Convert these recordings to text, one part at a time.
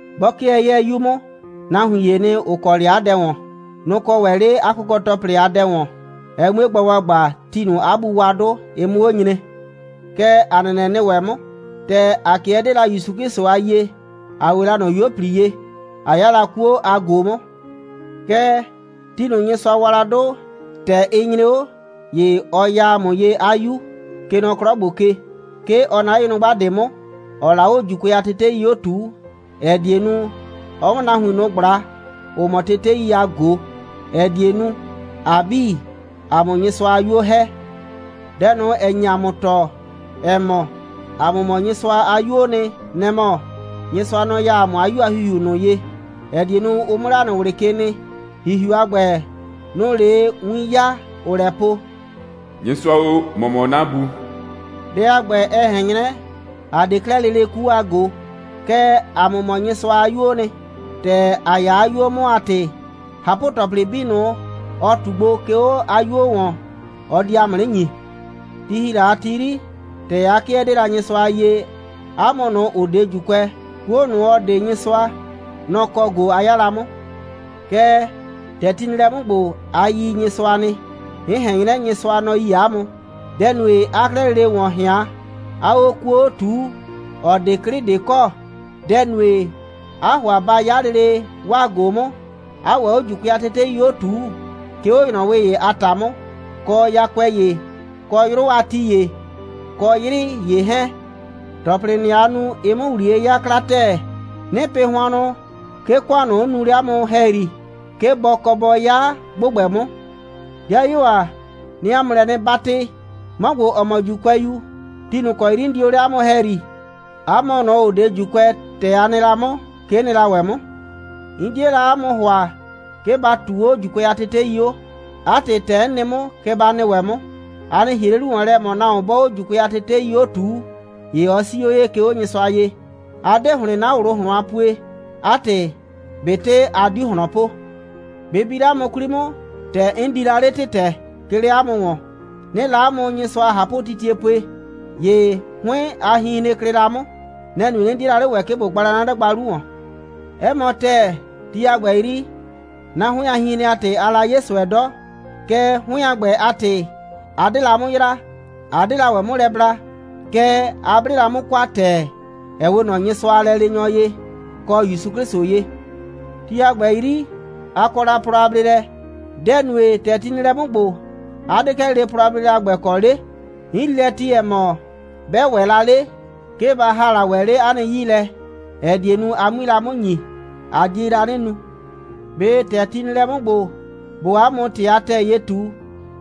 'Bɔ 'kɩɛ 'yɛɛ 'yu 'mʋ, nahuin ‑yee nɩ, ‑ʋ kɔ 'le 'a dɛ ‑wɔn. Nʋ‑ kɔ ‑wɛ 'le 'a kʋkɔ‑tɔplɩ a dɛ ‑wɔn, ɛ 'mue gba ‑gbagba, ti ꞊nʋ 'a bu wa 'dʋ, ɩ 'mʋ 'o nyre. Kɛ ‑a nɛnɛ nɩ ‑wɛ 'mʋ. ‑Tɛ ‑a 'kɩɛ 'dee la ‑Yusu 'Klɩsʋ a yie, ‑a 'we la ꞊nɔ 'yuo꞊pli ye, ꞊a 'ya la 'kuo a ꞊go 'mʋ. Kɛɛ, ti ꞊nʋ, Nyɩsʋa wa la 'dʋ, ‑tɛ ɩ nyre 'o, ‑ye ɔ ya ‑a mʋ ye 'a 'Yu, kɛ nɔ 'klɔ ‑gbo ke. 'Ke ɔ naa 'le nyrʋgba ꞊de 'mʋ, 'ɔɔ la 'o ‑Juukʋɛ a tetei 'o ꞊tuu, ‑ɛ die nu, ɔ 'mʋ nahuin ꞊nʋ ꞊gbla, ‑ʋ mɔ tetei a ‑gbɛ a ꞊go, ‑ɛ die nu, ‑a 'bii, ‑a 'mʋ Nyɩsʋa a 'yuo ‑hɛ. Dɛ ꞊nʋ, ‑ɛ nye ‑a mʋ tɔɔ, ‑ɛ mɔ, ‑a mʋ mɔ Nyɩsʋa a 'yuoo nɩ, nɛ‑ mɔ: Nyɩsʋa, nɔ‑ ya ‑a mʋ 'a 'Yu a ‑Hihiu ꞊nʋ ye, ‑ɛ die nu, ʋ 'mʋ 'le ‑a nɩ ꞊wlɩ ke nɩ. ‑Hihiu a ‑gbɛ, nʋ‑ʋ 'le win 'yaa, 'ʋʋ lɛ po: «Nyɩsʋa o, ‑mɔ mɔ 'na Bu.» Dɛ a ‑gbɛ, ɛ ꞊hɛn 'nyrɛ, a 'de 'klɛɛ lele 'kuo a ꞊go. Kɛɛ, 'a mʋ mɔ Nyɩsʋa a 'yuoo nɩ. ‑Tɛ a 'ya 'a 'yuo 'mʋ a ‑tɩ, ꞊hapʋ‑tɔplɩ 'bii ꞊nʋ, ɔ ꞊tu gbo, 'ke 'o 'a 'yuo ‑wɔn, ɔ di 'a mʋ 'nɩ ‑nyi. Ti ‑hi la a ti 'yri, ‑tɛ a 'kɩɛ 'dee la Nyɩsʋa a yie, 'a mʋ ꞊nʋ, ‑ʋ 'de ‑Juukʋɛ, 'kuo ꞊nʋ, ‑ɔ 'de Nyɩsʋa, nɔ‑ kɔ ꞊go a 'ya la 'mʋ. Kɛɛ, ‑tɛ ti nɩ lɛ 'mʋ ‑gbo, a yi Nyɩsʋa nɩ, 'n ꞊hɛn 'nyrɛ, Nyɩsʋa, nɔ‑ yi 'a mʋ. Dɛ‑ nue, 'aa 'klɛɛ lele ‑wɔn ꞊hɩan, 'aa 'o 'kuo 'o ꞊tuu, ‑ɔ 'de 'klɩ ꞊de kɔ? Dɛ‑ nue, 'aa ‑hʋa ba 'ya lele 'waa ꞊go 'mʋ, 'aa ‑wɛ 'o ‑Juukʋɛ a tetei ‑ye 'o ꞊tuu, 'ke 'o ‑nyrɔwɩ ‑ye a ‑ta 'mʋ, kɔ yakʋɛ ‑ye, kɔ 'yrʋ a ti ‑ye, kɔ 'yrɩ ‑ye 'hɛɛn? ‑Tɔplɩ ꞊nʋ, aa nu, ɩɩ 'mʋ ‑wliye 'yaa 'kla ‑tɛɛ. 'Nɩɩ pɩ hʋannʋ, 'ke ‑kʋan ꞊nʋ, 'n nuu 'le 'a mʋ ‑hɛyri, 'ke bɔ kɔ bɔ 'ya ‑gbʋgbɛ 'mʋ. 'Dɩayuo ‑a, 'nɩɩ 'a mʋ lɛ 'nɩ 'batɩ, 'mɔ ‑gbo, ‑ɔ mɔ ‑Juukʋɛyu, ti ꞊nʋ ‑kɔ 'yri 'n nɩ la 'le 'a mʋ ‑hɛyri, 'a mʋ ꞊nʋ, ‑ʋ 'de ‑Juukʋɛ, ‑tɛ a nɩ la 'mʋ, kɛ 'n nɩ la ‑wɛ 'mʋ. 'N 'die la 'a mʋ ‑hʋa, 'ke ba ꞊tuu 'o ‑Juukʋɛ a tetei 'o. 'A ‑tɩ, ‑tɛ 'n nɩ 'mʋ, kɛ ba nɩ ‑wɛ 'mʋ: A nɩ ‑hie 'le 'lu ‑wɔn lɛ, ‑ɛ mɔ, nahuon 'bɔɔ 'o ‑Juukʋɛ a tetei 'o ꞊tuu, ‑ye ɔ 'sii 'o ye, 'ke 'o Nyɩsʋa ye. A 'de ‑hlɩn 'na ꞊wlʋ ꞊hlɔn a pue. 'A ‑tɩ, ꞊betɩ a 'diu ꞊hlɔn po. Bɩ bi 'le 'a mʋ 'kwli 'mʋ, ‑tɛ 'n di la 'le ‑tɩtɛ, 'ke 'le 'a mʋ ‑wɔn, 'nɩɩ la 'a mʋ Nyɩsʋa a ꞊hapʋtitie pue, ‑ye 'hʋɩn a hinhren klɩ la 'mʋ. Nɛ‑ nue, 'nɩ 'die la 'le ‑wɛ, ꞊bo gba la 'na 'dagba 'lu ‑wɔn. 'Ɛ mɔ ‑tɛɛ, ti a ‑gbɛ 'yri, 'na 'hʋɩn a hinhren a ‑tɩ, aa la 'ye ꞊sʋɛ 'dɔ, kɛɛ, 'hʋɩn a ‑gbɛ a ‑tɩ, a 'de la 'mʋ yraa, 'a 'de la ‑wɛ 'mʋ lɛ bla. Kɛɛ, a 'ble la 'mʋ kwa ‑tɛɛ, ‑ɛ 'we ꞊nɔ Nyɩsʋa a lɛleenyɔ ye, kɔ ‑Yusu 'Klɩsʋ ye. Ti a ‑gbɛ 'yri, a kɔ la plɔ a bleelɛ. Dɛ‑ nue, ‑tɛ ti nɩ lɛ 'mʋ ‑gbo, 'a 'de 'klɛɛ lele plɔ a bleelɛdʋ a ‑gbɛ kɔ 'le? 'N yrii lɛ ti, ‑ɛ mɔ, 'bɛ ‑wɛ la 'le, 'ke ba ‑ha la ‑wɛ 'le 'a nɩ 'yii lɛ, ‑ɛ die nu, a 'mui la 'mʋ ‑nyi, a die la 'nɩ nu. ꞊Be ‑tɛ ti nɩ lɛ 'mʋ ‑gbo, ꞊boo 'a mʋ ‑tɩ a ‑tɛɛ ye ꞊tu,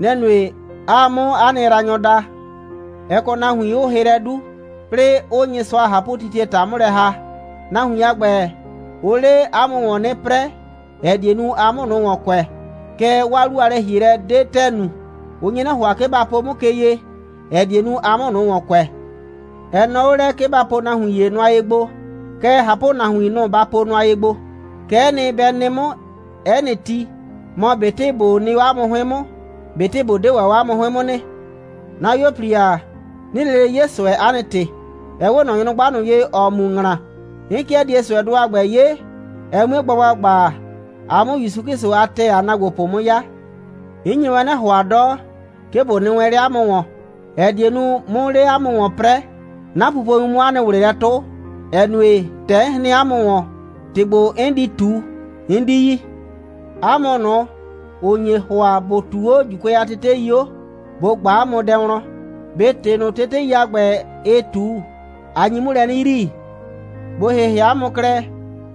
nɛ‑ nue, 'aa 'mʋ 'a nɩ yraanyɔ daa? Ɛ kɔ nahuin, 'ʋʋ hɩ lɛ 'du, 'plɩɩ, 'ʋʋ Nyɩsʋa a ꞊hapʋtitie ‑ta 'mʋ lɛ ‑ha. Nahuin a ‑gbɛ, ʋʋ 'le 'a mʋ ‑wɔn 'nɩ 'prɛɛ, ‑ɛ die nu, a 'mʋ ꞊nʋ ‑wɔn kʋɛ. Kɛɛ 'waa 'lu a lɛ‑hielɛ 'de ‑tɛɛ nu. Ʋ nye 'nɩ ‑hʋa, 'ke ba po 'mʋ ke ye, ‑ɛ die nu, a 'mʋ ꞊nʋ ‑wɔn kʋɛ. Ɛ nɔɔ 'o lɛ, 'ke ba po nahuin ‑ye nʋa ye gbo, kɛɛ, ꞊hapʋnahuin, nʋ‑ ba po nʋa ye gbo. Kɛ'ɛ nɩ, bɛ nɩ 'mʋ 'ɛ nɩ ti, mɔ ꞊betɩ ꞊bo nɩ 'o 'a mʋ 'hʋɩn 'mʋ, ꞊betɩ ꞊bo 'de 'o 'a mʋ 'hʋɩn 'mʋ nɩ. 'Na 'yuo꞊pli ‑a, 'nɩɩ lele 'ye ꞊sʋɛ, 'a nɩ ‑tɩ, ‑ɛ 'we ꞊nɔ nyrʋgba ye, ‑ɔɔ mu ‑ŋla. 'N 'kɩɛ die ꞊sʋɛdʋ a ‑gbɛ 'ye, ɛ 'mue gba ‑gbagba, a 'mʋ ‑Yusu 'Klɩsʋ a ‑tɛɛ a ‑naagbopʋ 'mʋ 'ya. 'N nye wɛn 'nɩ ‑hʋa 'dɔ, 'ke ꞊bo nɩ wɛn 'le 'a mʋ ‑wɔn, ‑ɛ die nu, 'mʋ 'le 'a mʋ ‑wɔn 'prɛɛ, 'na pupowin 'mʋ 'a nɩ ꞊wlɩ lɛ 'tʋ, ‑ɛ nue, ‑tɛ 'n hren 'a mʋ ‑wɔn, ‑tɩ ‑gbo, 'n di ꞊tu, 'n 'di yi. 'A mʋ ꞊nʋ, ‑ʋ nye ‑hʋa, ‑bʋ ꞊tuu 'o ‑Juukʋɛ a tetei 'o, ꞊bo ꞊gba 'a mʋ wlɔn: ꞊Be ‑tɩ ꞊nʋ, tetei a ‑gbɛ, ɩɩ ꞊tu, a nyi 'mʋ lɛ 'nɩ yrii? ꞊Bo ‑hɩhɩ 'a mʋ klɛ.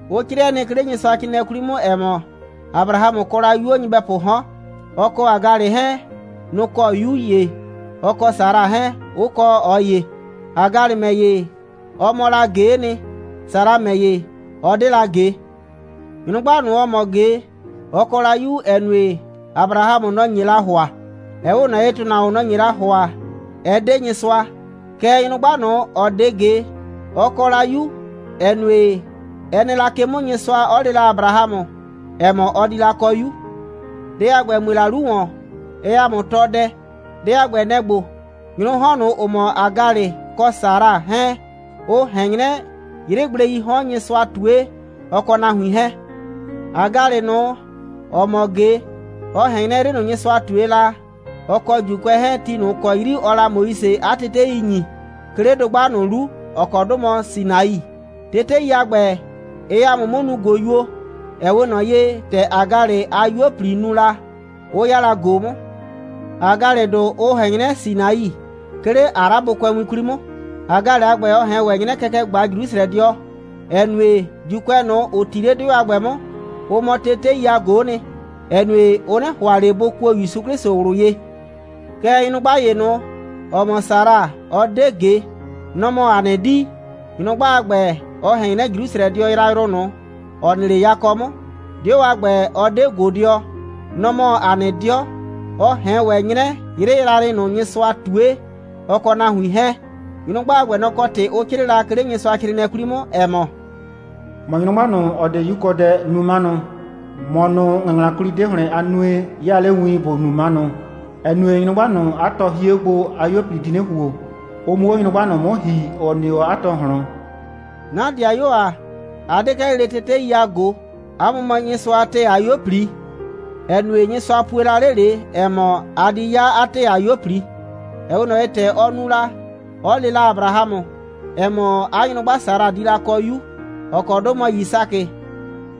Ʋ 'crɩɛ nɩ, 'ke 'le Nyɩsʋacrɩɩnɩɛ 'kwli 'mʋ, ‑ɛ mɔ, Abrahamʋ kɔ la 'yuo nyɩbɛpʋʋ 'hɔn. Ɔ kɔ Hagalɩ 'hɛɛn, nʋ‑ kɔ 'yu ‑ye, ɔ kɔ Sara 'hɛɛn, 'ʋ kɔ ꞊ɔ ‑ye. Hagalɩ ‑mɛ ‑ye, ɔ mɔ la ꞊ge'e nɩ. Sara ‑mɛ ‑ye, ɔ 'de la ꞊ge. Nyrʋgba ꞊nʋ, ‑ɔ mɔ ꞊ge, ɔ kɔ la 'yu, ‑ɛ nue, Abrahamʋ, nɔ‑ nye la ‑hʋa. Ɛ 'we ꞊nɔ ye, ‑tʋnahuon, nɔ‑ nye la ‑hʋa, ɛ 'de Nyɩsʋa. Kɛɛ, nyrʋgba ꞊nʋ, ‑ɔ 'de ꞊ge, ɔ kɔ la 'yu, ‑ɛ nue, ɛ nɩ la ke 'mʋ, Nyɩsʋa 'ɔ le la Abrahamʋ, ‑ɛ mɔ, ɔ di la kɔ 'yu. Dɛ a ‑gbɛ, ‑ɛ mue la 'lu ‑wɔn, ɛɛ ‑a mʋ tɔɔ dɛ. Dɛ a ‑gbɛ, nɛ‑ ‑gbo: Nyrʋʋ 'hɔn ꞊nʋ, ‑ʋ mɔ Hagalɩ kɔ Sara 'hɛɛn, ʋ ꞊hɛn 'nyrɛ 'yrɩgbleii 'hɔn, Nyɩsʋa ꞊tue, ɔ kɔ nahuin 'hɛɛn. Hagalɩ ꞊nʋ, ‑ɔ mɔ ꞊ge, ɔ ꞊hɛn 'nyrɛ 'yrɩ ꞊nʋ, Nyɩsʋa ꞊tue la, ɔ kɔ ‑Juukʋɛ 'hɛɛn, ti ꞊nʋ ‑kɔ 'yri ɔɔ la Moise 'a tetei ‑nyi, 'ke 'le dʋgba ꞊nʋ 'lu, ‑ɔ kɔ 'dʋ mɔ Sinai. Tetei a ‑gbɛ, ɩɩ ‑a mʋ 'mʋ nuu ꞊goyuo, ‑ɛ 'we ꞊nɔ ye, ‑tɛ Hagalɩ a 'yuo꞊pli nu la, 'ʋ 'ya la ꞊go 'mʋ. Hagalɩdʋ, ʋ ꞊hɛn 'nyrɛ Sinai, 'ke 'le Arabʋkʋɛwin 'kwli 'mʋ. Hagalɩ a ‑gbɛ, ɔ ꞊hɛn ‑wɛ 'nyrɛ kɛkɛ a Jrusrɛdɩɔ, ‑ɛ nue, ‑Juukʋɛ ꞊nʋ, ‑ʋ 'ti 'le 'dɩɔ a ‑gbɛ 'mʋ, ʋ mɔ tetei a ꞊go'o nɩ, ‑ɛ nue, ʋ 'nɩ ‑hʋa ꞊le bʋ kuo ‑Yusu 'Klɩsʋ ꞊wlʋ ye. Kɛɛ, nyrʋgba ‑ye ꞊nʋ, ‑ɔ mɔ Sara, ‑ɔ 'de ꞊ge, nɔ‑ mɔ ‑a nɩ 'dii. Nyrʋgba a ‑gbɛ, ɔ ꞊hɛn 'nyrɛ Jrusrɛdɩɔ yrayrʋ ꞊nʋ, ‑ɔ nɩ 'le yakɔ 'mʋ. 'Dɩɔ a ‑gbɛ, ɔ 'de ꞊godɩɔ. Nɔ‑ mɔ ‑a nɩ 'dɩɔ. (Ɔ ꞊hɛn ‑wɛ 'nyrɛ 'yrɩ yrayrɩ ꞊nʋ, Nyɩsʋa ꞊tue, ɔ kɔ nahuin 'hɛɛn.) Nyrʋgba a ‑gbɛ, nɔ‑ kɔ ‑tɩ ʋ 'crɩɩ la, 'ke 'le Nyɩsʋacrɩɩnɩɛ 'kwli 'mʋ, ‑ɛ mɔ: «‑Mɔ nyrʋgba ꞊nʋ, ‑ɔ 'de 'yukɔdɛ, nu 'manʋ. ‑Mɔ ꞊nʋ, ‑ŋɩŋlakwli 'de ‑hlɩn a nue, 'yaa 'le win, ‑bo nu 'manʋ, ‑ɛ nue, nyrʋgba ꞊nʋ, 'a tɔ hie 'o gbo, 'a 'yuo꞊pli di 'nɩ ‑huo, ʋ 'mʋ 'o nyrʋgba ꞊nʋ 'mʋ ‑hi, ‑ɔ nɩ 'o 'a tɔ ꞊hlɔn.» 'Na ‑dɩayuo ‑a, a 'de 'klɛɛ lele tetei a ꞊go, 'a mʋ mɔ Nyɩsʋa a ‑tɛɛ a 'yuo꞊pli, ‑ɛ nue, Nyɩsʋa pue la 'le ꞊le, ‑ɛ mɔ, a di 'ya 'a ‑tɛɛ 'a 'yuo꞊pli, ‑ɛ 'we ꞊nɔ ye, ‑tɛ ɔ nu, 'ɔ le la Abrahamʋ, ‑ɛ mɔ, 'a nyrʋgba Sara di la kɔ 'yu, ‑ɔ kɔ 'dʋ mɔ Yisakɩ.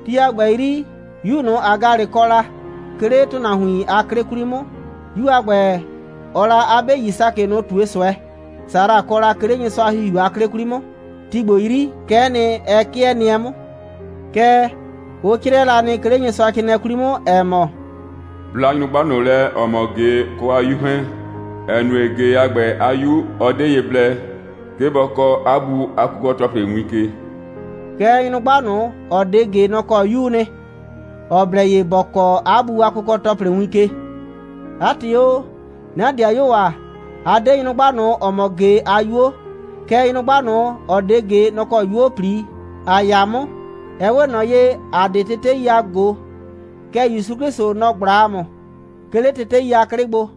Ti a ‑gbɛ 'yri, 'yu ꞊nʋ, Hagalɩ kɔ la, 'ke 'le ‑tʋnahuin a 'klɩ 'kwli 'mʋ, 'yu a ‑gbɛ, ɔɔ la 'a 'be Yisakɩ ꞊nʋ ꞊tue ꞊sʋɛ, Sara kɔ la, 'ke 'le Nyɩsʋa a ‑Hihiu a 'klɩ 'kwli 'mʋ. Ti ‑gbo 'yri, kɛ'ɛ nɩ, ɛ 'kɩɛ nɩɛ 'mʋ. Kɛɛ, ʋ 'crɩɛ la nɩ, 'ke 'le Nyɩsʋacrɩɩnɩɛ 'kwli 'mʋ, ‑ɛ mɔ: «Bla nyrʋgba ꞊nʋ lɛ, ‑ɔ mɔ ꞊ge, ɔ kɔ 'a 'yu 'hɛɛn, ‑ɛ nue, ꞊ge a ‑gbɛ a 'yu, ɔ 'de ye blɛ, 'ke bɔ kɔɔ 'a bu a kʋkɔ‑tɔplɩ win ke.» Kɛɛ, nyrʋgba ꞊nʋ, ‑ɔ 'de ꞊ge, nɔ‑ kɔ 'yuu nɩ, ‑ɔ blɛ ye ‑bɔ kɔɔ 'a bu a kʋkɔ‑tɔplɩ win ke. 'A ‑tɩ o, 'na ‑dɩayuo ‑a, ‑a 'de nyrʋgba ꞊nʋ, ‑ɔ mɔ ꞊ge a 'yuo, kɛɛ, nyrʋgba ꞊nʋ, ‑ɔ 'de ꞊ge, nɔ‑ kɔ 'yuo꞊pli ‑a 'ya 'mʋ. Ɛ 'we ꞊nɔ ye, ‑a 'de tetei a ꞊go, kɛɛ, ‑Yusu 'Klɩsʋ, nɔ‑ ꞊gbla ‑a mʋ, 'ke 'le tetei a 'klɩ gbo.